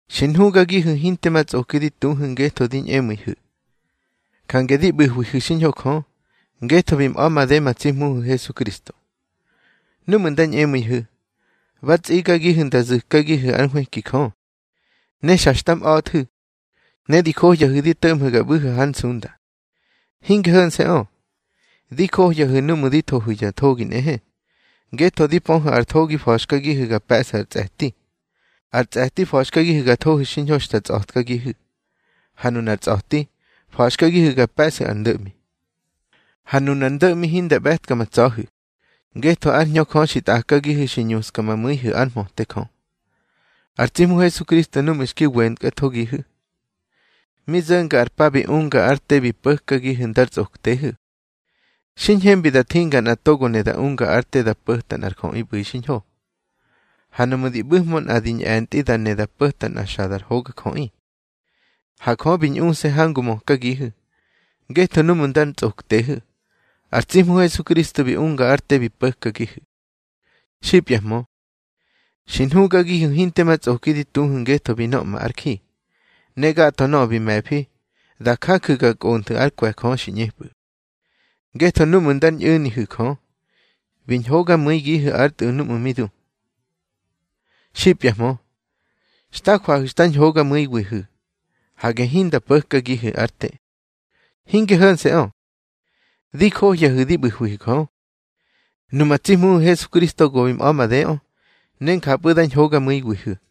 Xi nhugagihu̱ hinte ma tsꞌoki di tuhu̱ ngetho di ñꞌemu̱ihu̱. Jange di ꞌbu̱hwihu̱ xiñho Jö, ngetho bi mꞌa̱ made ma tsi Hmuhu̱ Hesukristo. Númꞌu̱ nda ñꞌemu̱ihu̱, ba tsigagihu̱ nda zu̱kagihu̱ ár nhwëki Jö. Ne xa xta mꞌa̱thu̱, ne di johyahu̱ di to̱ꞌmhu̱ ga ꞌbu̱hu̱ hár nsunda. Hinge ho̱nse̱ꞌö. Di johyahu̱ núꞌmu̱ di thohu̱ ya thogi nꞌehe, ngetho di pöhu̱ ar thogi fa̱xkagihu̱ ga pe̱ꞌsu̱ ar tsꞌe̱ti. Ar tsꞌe̱ti fa̱xkagihu̱ ga thohu̱ xiñho xta tsꞌa̱tkagihu̱, ha nunar tsꞌa̱ti fa̱xkagihu̱ ga pe̱ꞌsu̱ ar ndo̱ꞌmi. Ha nunar ndo̱ꞌmi hinda ꞌbe̱tka ma tsa̱hu̱, ngetho ár Hñö Jö xi tꞌakagihu̱ xi ñuska ma mu̱ihu̱ ár mhöte Jö. Ar tsi Hmu Hesukristo núꞌmu̱ xki wentkathogihu̱, mi zo̱nga ar pa bi unga ár te bi po̱kagihu̱ ndar tsꞌoktehu̱. Xi ñhembi da thinga nꞌa togo ne da unga ár te da po̱ta nꞌar jöꞌi ꞌbu̱i xiñho. Ha nuꞌmu̱ di ꞌbu̱hmö nꞌa di ñꞌe̱ntꞌi da ne da po̱ta nꞌa xa dar hogajöꞌi. Ha Jö bi ñꞌuse̱ hangu mökagihu̱, ngetho núꞌmu̱ ndar tsꞌoktehu̱, ar tsi Hmu Hesukristo bi unga ár te bi po̱kagihu̱. Xipyahmö, xi nhugagihu̱ hinte ma tsꞌoki di tuhu̱ ngetho bi nöꞌma ár ji, ne gatho nöꞌö bi me̱fi da jaju̱ ga kꞌonthu̱ ár kwe̱ Jö xi ꞌñepꞌu̱. Ngetho núꞌmu̱ ndar ñꞌu̱nihu̱ Jö, bi ñhogamu̱igihu̱ ár Tꞌu̱ núꞌmu̱ mi du. Xipyahmö, xta jwahu̱ xta ñhogamu̱iwihu̱, hage hinda po̱kagihu̱ ár te. Hinge ho̱nse̱ꞌö, di johyahu̱ di ꞌbu̱hwihu̱ Jö. Numa tsi Hmuhu̱ Hesukristo go bi mꞌa̱ madeꞌö, ne njapꞌu̱ da ñhogamu̱iwihu̱.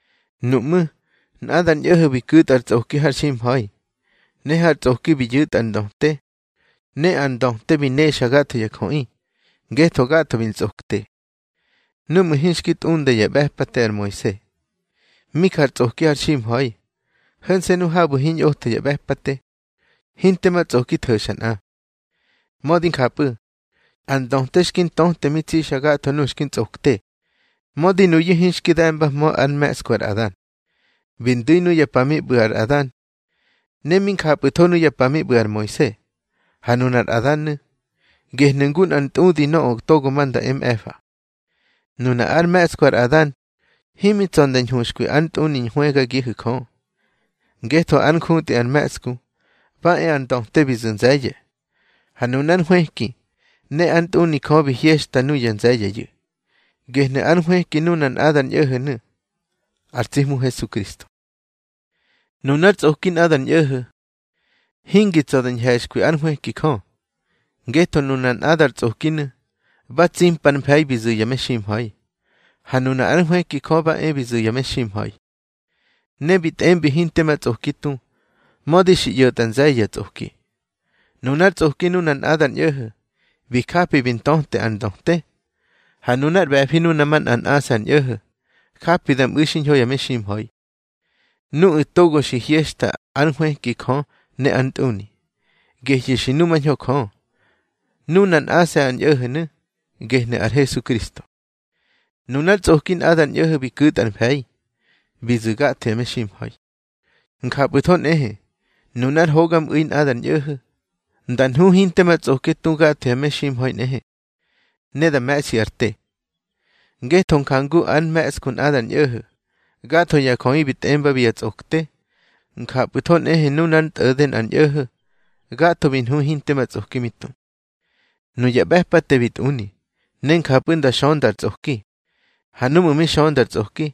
Nuꞌmú̱, nꞌadar ñꞌo̱ho̱ bi ku̱tꞌa ar tsꞌoki har ximha̱i, ne har tsꞌoki bi yu̱tꞌa ar ndöte. Ne ar ndöte bi nexa gatho ya jöꞌi, ngetho gatho bi ntsꞌokte. Númꞌu̱ hinxki tꞌunda yá ꞌbe̱pate ar Moise, mi jar tsꞌoki har ximha̱i. Ho̱nse̱ nu habu̱ hiñꞌotho ya ꞌbe̱pate, hinte ma tsꞌoki tho̱xa nꞌa. Mödi njapꞌu̱, ar ndöte xki ntöte mi tsixa gatho nuꞌu̱ xki ntsꞌokte, mödi nuyu̱ hinxki de̱mbahmö ár mhe̱ꞌsku ar Adan. Bi ndu̱i nuya pa mi ꞌbu̱ ar Adan, ne mi njapꞌu̱tho nuya pa mi ꞌbu̱ ar Moise. Ha nunar Adan nu̱, gehnu̱ ngu nꞌar ntꞌudi nöꞌö togo ma nda e mꞌe̱fa. Nuna ár mhe̱ꞌsku ar Adan himi tsa̱ nda ñhuxkwi ár ntꞌuni hwëgagihu̱ Jö. Ngetho ár njutꞌi ar mhe̱ꞌsku, ba e ar ndöte bi zu̱ nze̱ye̱. Ha nunár nhwëki ne ár ntꞌuni Jö bi hyexta nuya nze̱ye̱yu̱, gehnu̱ ár nhwëki nuna nꞌadar ñꞌo̱ho̱nu̱, ar tsi Hmu Hesukristo. Nunár tsꞌoki nꞌadar ñꞌo̱ho̱, hingi tsa̱ da ñhe̱xkwi ár nhwëki Jö. Ngetho nunar nꞌadar tsꞌokinu̱, ba tsimpar mfe̱i bi zu̱ ya meximha̱i. Ha nuna ár nhwëki Jö ba e bi zu̱ ya meximha̱i, ne bi tꞌembi hinte ma tsꞌoki tu, mödi xi ꞌyo̱tꞌa nze̱ye̱ ya tsꞌoki. Nunár tsꞌoki nuna nꞌadar ñꞌo̱ho̱, bi japi bi ntöte ar ndöte. Ha nunár ꞌbe̱fi nuna manꞌa nꞌase̱ ar ñꞌo̱ho̱, japi da mꞌu̱ xiñho ya meximha̱i, nuꞌu̱ togo xi hyexta ár nhwëki Jö ne ár ntꞌuni, gehyu̱ xi numañho Jö. Nuna nꞌase̱ ar ñꞌo̱ho̱nu̱, gehnu̱ ar Hesukristo. Nunár tsꞌoki nꞌadar ñꞌo̱ho̱ bi ku̱tꞌa ar mfe̱i, bi zu̱ gatho ya meximha̱i. Njapꞌu̱tho nꞌehe, nunár hogamꞌu̱i nꞌadar ñꞌo̱ho̱, nda nhu hinte ma tsꞌoki tu gatho ya meximha̱i nꞌehe, ne da me̱ꞌsyu̱ ar te. Ngetho njangu ár mhe̱ꞌsku nꞌadar ñꞌo̱ho̱, gatho ya jöꞌi bi tꞌembabi ya tsꞌokte. Njapꞌu̱tho nꞌehe nunár ntꞌo̱de nꞌar ñꞌo̱ho̱, gatho bi nhu hinte ma tsꞌoki mi tu. Nuya ꞌbe̱pate bi tꞌuni, ne njapꞌu̱ nda xönda ar tsꞌoki. Ha núꞌmu̱ mi xönda ar tsꞌoki,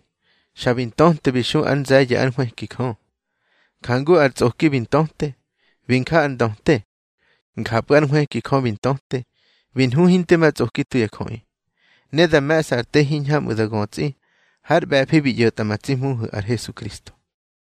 xa bi ntöte bi xu ár nze̱ye̱ ár nhwëki Jö. Njangu ar tsꞌoki bi ntöte, bi nja ar ndöte, njapꞌu̱ ár nhwëki Jö bi ntöte, bi nhu hinte ma tsꞌoki tu ya jöꞌi. Ne da me̱ꞌsa ar te hiñhamꞌu̱ da götsꞌi har ꞌbe̱fi bi ꞌyo̱tꞌa ma tsi Hmuhu̱ ar Hesukristo.